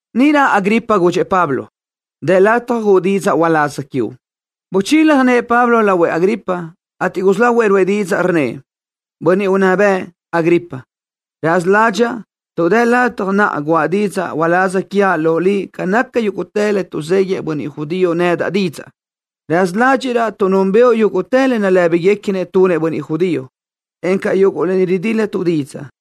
Níʼirö Agripa gudxëʼ Pablo: —Dë lataj guʼu didzaʼ uláz quiuʼ. Buchila nëʼë Pablo lahuëʼ Agripa, ateʼ gusí lahuëʼ ruʼë didzaʼ, rnnëʼ: —Bönniʼ unná bëʼ, Agripa. Raza ládxaʼa tuʼ dë lataj naʼa guʼa didzaʼ uláz quiaʼ loʼ liʼ ca naca yúguʼtë le tuʼzéguiëʼ bönniʼ judío nedaʼ didzaʼ. Raza ládxiʼraʼ tuʼ núnbëʼu yúguʼtë le nalë́biguequinëʼ tunëʼ bönniʼ judío, encaʼ yuguʼ lë ni ridíl-latuʼ didzaʼ.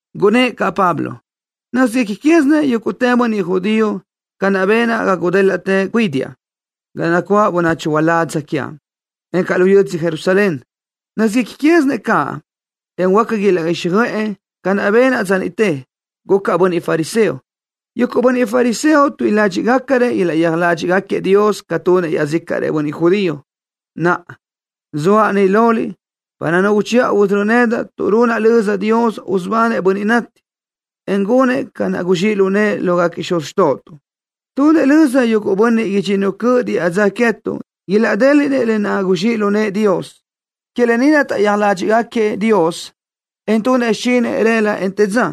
Gunnë́ʼ caʼ Pablo: —Nö́zguequi quézinëʼ yúguʼtë bönniʼ judío ca naʼ benaʼ ga gudélaʼtë cuídiaʼ ga nacuáʼ bönachi uládz quiaʼ, encaʼ lu yödzö Jerusalén. Nö́zguequi quézinëʼ caʼ, en huáca ilaʼguíxjöʼë ca naʼ benaʼ dza niʼte. Gucaʼ bönniʼ fariseo. Yuguʼ bönniʼ fariseo tuíʼi ládxiʼgacarëʼ ilaʼyéaj ládxiʼgaquiëʼ Dios ca tunëʼ iaʼzícaʼrëʼ bönniʼ judío. Naʼa, zoaʼ ni loliʼ para nu uchiʼa usörö́ nedaʼ tuʼ runaʼ löza Dios, usubanëʼ bönniʼ nati, en gunëʼ ca naʼ guzxíʼ lu nëʼë lógaquiëʼ xuz xtóʼotuʼ. Tunëʼ löza yuguʼ bönniʼ idxinnu cöʼ diʼa dza queë́tuʼ ilaʼdéliʼnëʼ lë naʼ guzxíʼ lu nëʼë Dios. Que lë ni naʼ taʼyéaj ládxiʼgaquiëʼ Dios, en tunëʼ xichinëʼ rëla, en të dza.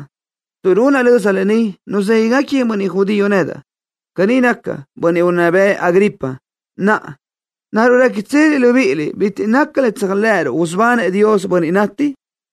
Tuʼ runaʼ löza lë ni, nuzéguigaquiëʼ bönniʼ judío nedaʼ. Caní naca, bönniʼ unná bëʼ, Agripa. Naʼa, ¿naruʼ réquitseliʼ libíʼiliʼ bitiʼ naca le tséajlëʼëruʼ, usubanëʼ Dios bönniʼ nati?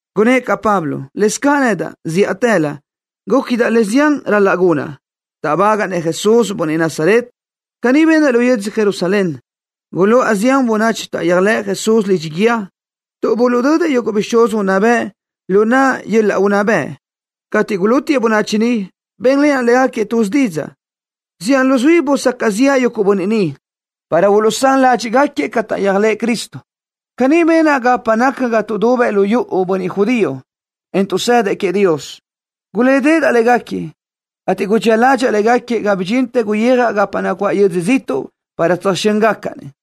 Gunnë́ʼ caʼ Pablo: —Lëzcaʼ nedaʼ, zíʼatëlö gúquidaʼ le zián ral-laʼ gunaʼ, táʼbagaʼa-nëʼ Jesús, bönniʼ Nazaret. Caní benaʼ lu yödzö Jerusalén. Guluʼa zián bönachi taʼyéajlëʼ Jesús lidxi guíë, tuʼ buluʼdödëʼ yuguʼ bixúz unná bëʼ lu naʼa yöl-laʼ unná bëʼ. Cateʼ gulútiëʼ bönachi niʼ, bénlenaʼ légaquiëʼ tuz didzaʼ. Zián luzuí busacaʼ ziʼa yuguʼ bönniʼ niʼ para uluʼsán ládxiʼgaquiëʼ ca taʼyéajlëʼë Cristo. Caní benaʼ gapa naca lu yuʼu ga tuʼdubëʼ bönniʼ judío, en tuʼsëdëʼ queëʼ Dios. Gulédeʼedaʼ légaquiëʼ, ateʼ gudxía ládxaʼa légaquiëʼ ga bidxintë guyijaʼ gapa nacuáʼ yödzö ziʼtuʼ para tsöjxö́ngacaʼ-nëʼ.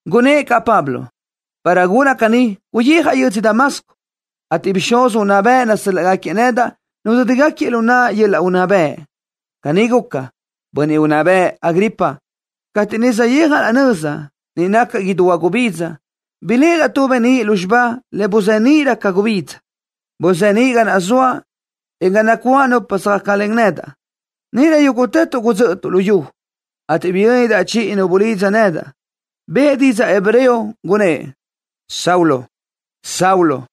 Gunnë́ʼ caʼ Pablo: —Para gunaʼ caní guyijaʼ yödzö Damasco, ateʼ bixúz unná bëʼ nasö́l-laʼgaquiëʼ nedaʼ nudö́digaquiëʼ lu naʼa yöl-laʼ unná bëʼ. Caní guca, bönniʼ unná bëʼ, Agripa. Cateʼ niʼ saʼyijaʼ laʼ nöza, niʼ naca idú huagubidza, biléʼedaʼ tu beníʼ lúzxiba le buzeníʼrö ca gubidza. Buzeníʼ ga naʼ zoaʼ, en ga nacuáʼ nupa söjácalen nedaʼ. Níʼirö yúguʼtëtuʼ gudzö́ʼötuʼ lu yu, ateʼ biyöndaʼ chiʼi nu bulidza nedaʼ. Bëʼë didzaʼ hebreo, gunnë́ʼ: “Saulo, Saulo,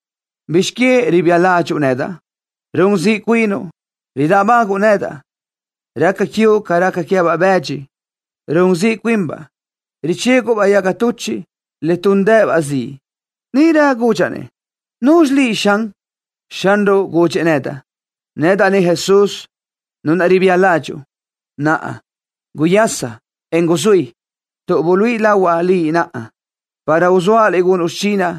¿bizx que ribía ládxuʼu nedaʼ? Run ziʼ cuinuʼ, ridáʼbaguʼu nedaʼ. Raca quiuʼ ca raca queë́baʼ bëdxi, run ziʼ cuinbaʼ, richéguʼbaʼ yaga tuchiʼ le túndëʼë-baʼ ziʼ.” Níʼirö gudxaʼ-nëʼ: “¿Nuzxi liʼ, Xan?” Xanruʼ gudxëʼ nedaʼ: “Nedaʼ ni Jesús, Nu naʼ ribía ládxuʼu. Naʼa, guyasa, en guzuí, tuʼ buluíʼi lahuaʼ liʼ naʼa, para uzóaʼ liʼ gunuʼ xichinaʼ,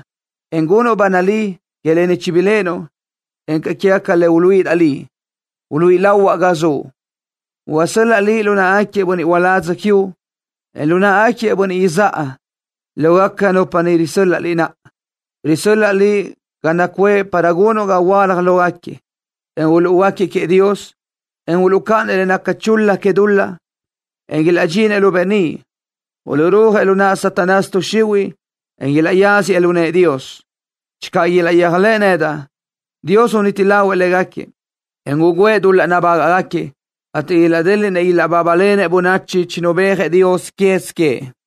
en gunuʼ ba nalí que lë ni chibiléʼenuʼ, encaʼ quégaca le uluíʼidaʼ liʼ, uluíʼi lahuaʼ ga zuʼ. Usöláʼ liʼ lu náʼagaquiëʼ bönniʼ uládz quiuʼ, en lu náʼagaquiëʼ bönniʼ izáʼa, lógaca nupa niʼ risö́l-laʼa liʼ naʼa. Risö́l-laʼa liʼ ga naʼ nacuʼë para gunuʼ ga uluʼhuöálaj guiö́j lógaquiëʼ, en uluʼhuöáquiëʼ queëʼ Dios, en uluʼcáʼanëʼ le naca chul-la que dul-laʼ, en ilaʼdxinëʼ lu beníʼ. Uluʼrúajëʼ lu naʼ Satanás tuʼ xihuiʼ, en ilaʼyáziëʼ lu nëʼë Dios. Channö ilaʼyéajlëʼë nedaʼ, Dios uniti lahuëʼ légaquiëʼ, en ugǘëʼ dul-laʼ nabágaʼgaquiëʼ, ateʼ ilaʼdéliʼnëʼ ilaʼbábalenëʼ bönachi chinubéajëʼ Dios quez queëʼ.”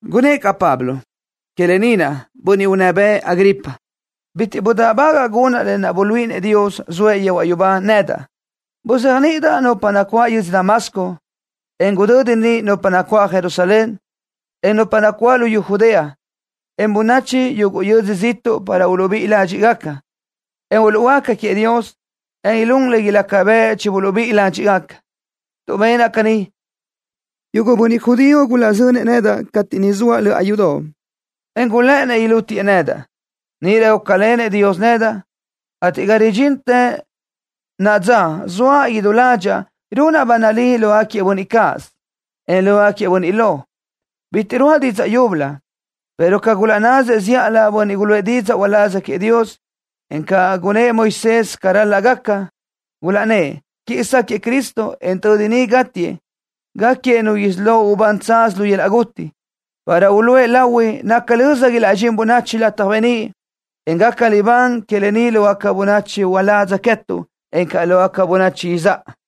Gunnë́ʼ caʼ Pablo: —Qui lë ni naʼ, bönniʼ unná bëʼ, Agripa, bitiʼ gudáʼbagaʼa gunaʼ le buluíʼinëʼ Dios, zoëʼ yehuaʼ yubá, nedaʼ. Buzéajniʼidaʼ nupa nacuáʼ yödzö Damasco, en gudödi niʼ nupa nacuáʼ Jerusalén, en nupa nacuáʼ luyú Judea, en bönachi yuguʼ yödzö ziʼtuʼ para uluʼbíʼi ládxiʼgaca, en uluʼhuöáca queëʼ Dios, en ilún le ilaca bëʼ chibuluʼbíʼi ládxiʼgaca. Tuʼ benaʼ caní, yuguʼ bönniʼ judío gulaʼzönëʼ nedaʼ cateʼ niʼ zoaʼ löʼa yudoʼ, en gulë́ʼënnëʼ ilútiëʼ nedaʼ. Níʼirö gúcalenëʼ Dios nedaʼ, ateʼ ga ridxintë naʼa dza zoaʼ idú ládxaʼa, runaʼ ba nalí lógaquiëʼ bönniʼ cáʼasö, en lógaquiëʼ bönniʼ lo. Bitiʼ ruáʼa didzaʼ yúbölö, pero ca gulaʼnnasëʼ zíʼalö bönniʼ guluʼë didzaʼ uláz queëʼ Dios, encaʼ ca gunnë́ʼ Moisés ca ral-laʼ gaca. Gulaʼnnë́ʼ: “Quiʼi sáquëʼë Cristo, en tödi gátiëʼ, gáquiëʼ nu isí lo ubán tsaz lu yöl-laʼ guti, para uluʼë lahui naca löza ilaʼdxín bönachi lataj beníʼ, en gaca libán que lë ni lógaca bönachi uládz queë́tuʼ, encaʼ lógaca bönachi izáʼa.”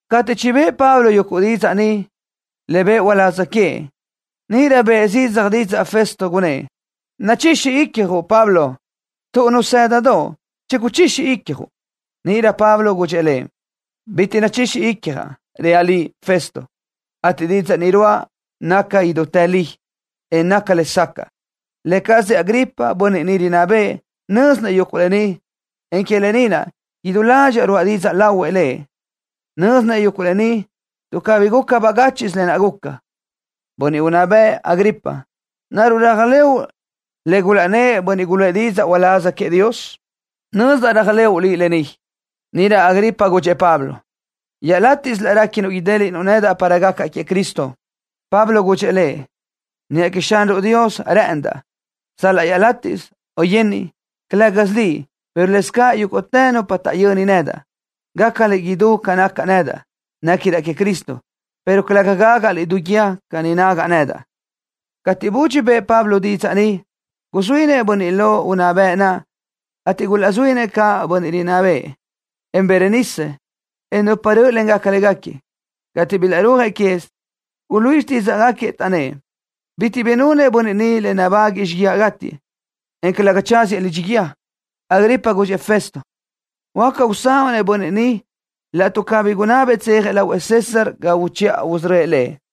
Cateʼ chibë́ʼë Pablo yuguʼ didzaʼ ni, le bëʼë uláz queëʼ, níʼirö bëʼë zidzaj didzaʼ Festo, gunnë́ʼ: —¡Nachixi icjuʼ, Pablo! ¡Tuʼ nazë́dadoʼo, chiguchixi icjuʼ! Níʼirö Pablo gudxëʼ lëʼ: —Bitiʼ nachixi icjaʼ, reaʼ liʼ, Festo, ateʼ didzaʼ ni ruáʼa naca idútë li, en naca lesacaʼ. Lë cazëʼ Agripa, bönniʼ ni rinná bëʼë, nö́zinëʼ yuguʼ lë ni, en que lë ni naʼ, idú ládxaʼa ruáʼa didzaʼ lahuëʼ lëʼ. Nö́zinëʼ yuguʼ lë ni, tuʼ cabí guca bagáchiʼsö lë naʼ guca. Bönniʼ unná bëʼ, Agripa. ¿Naruʼ réajlëʼu le gulaʼnnë́ʼ bönniʼ guluʼë didzaʼ uláz queëʼ Dios? Nözdaʼ réajlëʼu lë ni. Níʼirö Agripa gudxëʼ Pablo: —Iaʼlátiʼsö laʼ réquinuʼ idéliʼnuʼ nedaʼ para gacaʼ queëʼ Cristo. Pablo gudxëʼ lëʼ: —Niʼa queëʼ Xanruʼ Dios rë́ʼëndaʼ, sal-laʼ iaʼlátiʼsö o yenniʼ, calë́gasö liʼ, pero lëscaʼ yúguʼtë nupa ni taʼyöni nedaʼ, gácaliʼ idú ca nacaʼ nedaʼ, néquidaʼ queëʼ Cristo, pero calëga gágaʼliʼ du guíë ca ni nágaʼa nedaʼ. Cateʼ budxi bëʼë Pablo didzaʼ ni, guzuínëʼ bönniʼ lo unná bëʼ naʼ, ateʼ gulazuínëʼ caʼ bönniʼ rinná bëʼë, en Berenice, en nupa rö́ʼlengaca légaquiëʼ. Cateʼ bilaʼrúajëʼ quez, guluíʼi xtídzaʼgaquiëʼ, taʼnnë́ʼ: —Bitiʼ bi nunëʼ bönniʼ ni le nabáguëʼë xíguiaʼ gátiëʼ, en calëga tsáziëʼ lidxi guíë. Agripa gudxëʼ Festo: —Huáca usanuʼ-nëʼ bönniʼ ni laʼtuʼ cabí gunabëʼ tsejëʼ lahuëʼ César ga uchiʼa usörö́ëʼ lëʼ.